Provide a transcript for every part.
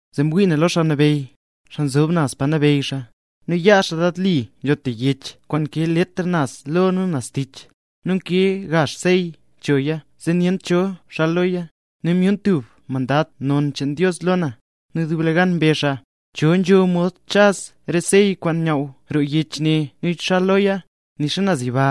Zee mwii na lo Xaa Nabeyy, xaa nzob naz pa nabeyy xaa, nu yaa xaa lad li nzho tub yech kwaan nkee letr naz lo nu naz tich, nu nkee gazh sey choya zee nyent cho xal loya. Nu myun tub mandad non cheen Dios lo na, nu dub gan mbezh xaa: —¿Cho nzho mod chaz re sey kwaan nyaww roo yech ne nu xal loya? Nixa naz yiba,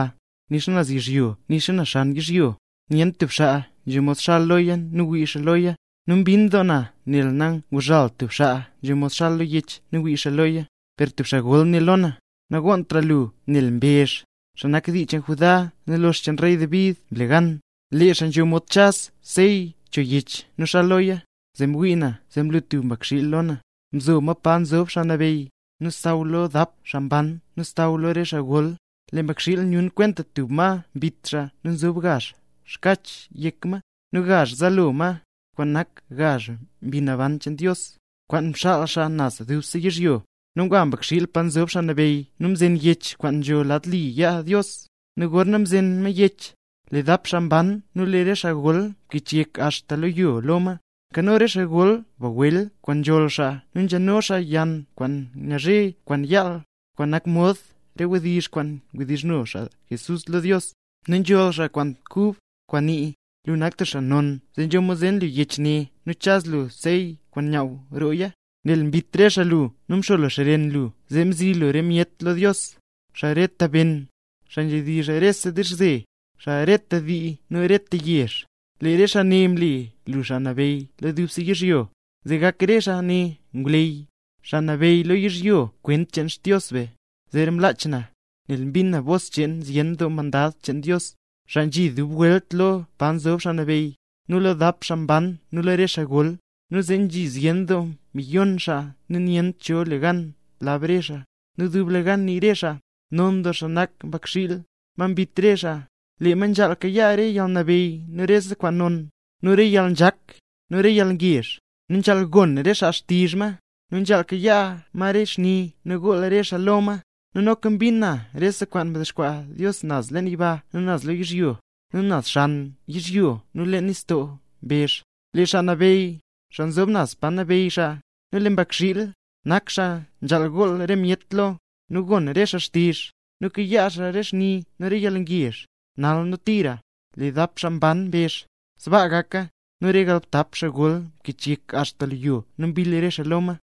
nixa naz yizhyo nu nixa xan yizhyo, nyent tub xaa nzho mod xal lo yech ne nu wii xaa loya. Nu mbinn doo na nel nanguzhalt tub xaa nzho mod xal lo yech nu wii xaa loya. Per tub re xaa gol né lo na: —Nagonntra lu nel lee Mbezh, xaa nak dii cheen Judá nu lox cheen rey David mle gan. Lee xaa nzho mod chaz sey cho yech nu xal loya. Zee mwii na zee mlu tub Mbakxiil lo na. Mzo ma pa nzob Xaa Nabeyy, nu xsaww lo dap xaa mban nu xsaww lo re xaa gol. Lee Mbakxiil nyun kwenta tub ma mbit xaa nu nzob gazh xkach yek ma, nu gazh zaalo ma, kwaan nak gazh mbi naban cheen Dios, kwaan mxaal xaa naz dubse yizhyo. Nu ngwa Mbakxiil pa nzob Xaa Nabeyy nu mzen yech kwaan nzho lad li yaa Dios. Nu gorna mzen ma yech, lee dap xaa mban nu lee re xaa gol mkichyek axta lo yo lo ma. Nkano re xaa gol bagwel kwaan nzholl xaa nu nzhano xaa yann kwaan ngazhe kwaan yaal, kwaan nak mod re wdizh kwaan wdizhno xaa mle nambey Jesús lo Dios. Nu nzholl xaa kwaan kub, kwaan nii: Lu nak tub xaa non zee nzho mod zen lu yech ne nu chaz lu re sey kwaan nyaaw rooya, nel mbit re xaa lu nu mxo lu xren lu zee mzi lu re myet lo Dios: xaa reta ben, xaa nzhedizh rese dizhze, xaa reta dii nu xaa reta yezh. Lee re xaa ne mle lu xaa nabeyy lo dubse yizhyo, zee gak re xaa ne ngwleyy, xaa nabeyy lo yizhyo kwent cheen Xdios be. Zeera mlach na, nel mbin na bos cheen zyen doo mandad cheen Dios, xaa nzhi dub welt lo pa nzob Xaa Nabeyy, nu lo dap xaa mban nu lo re xaa gol. Nu nzhi zyen doo miyon xaa nu nyent cho le gan lab re xaa, nu dublegan nii re xaa: Non doo xaa nak Mbakxiil, ma mbit re xaa. Lee ma nzhaal kayaa re yalnabeyy nu rese kwaan non, nu re yalnzhak, nu re yalngezh, nu nzhaal gon re xaa xtizh ma, nu nzhaal kayaa ma re xni nu gool re xaa lo ma. Nu noka mbin na rese kwaan mdexkwaa Dios naz leen yiba nu naz lo yizhyo, nu naz xan yizhyo nu leen nistoo mbezh: ¡Lee Xaa Nabeyy, xaa nzob naz pa nabeyy xaa, nu lee Mbakxiil, nak xaa nzhaal gool re myet lo, nu gon re xaa xtizh, nu kayaa xaa re xni nu re yalngezh, nal nu tira! Lee dap xaa mban mbezh: —¡Sbaa gaka! Nu lee re galbtap xaa gol mkichyek axta lo yo nu mbill re xaa lo ma.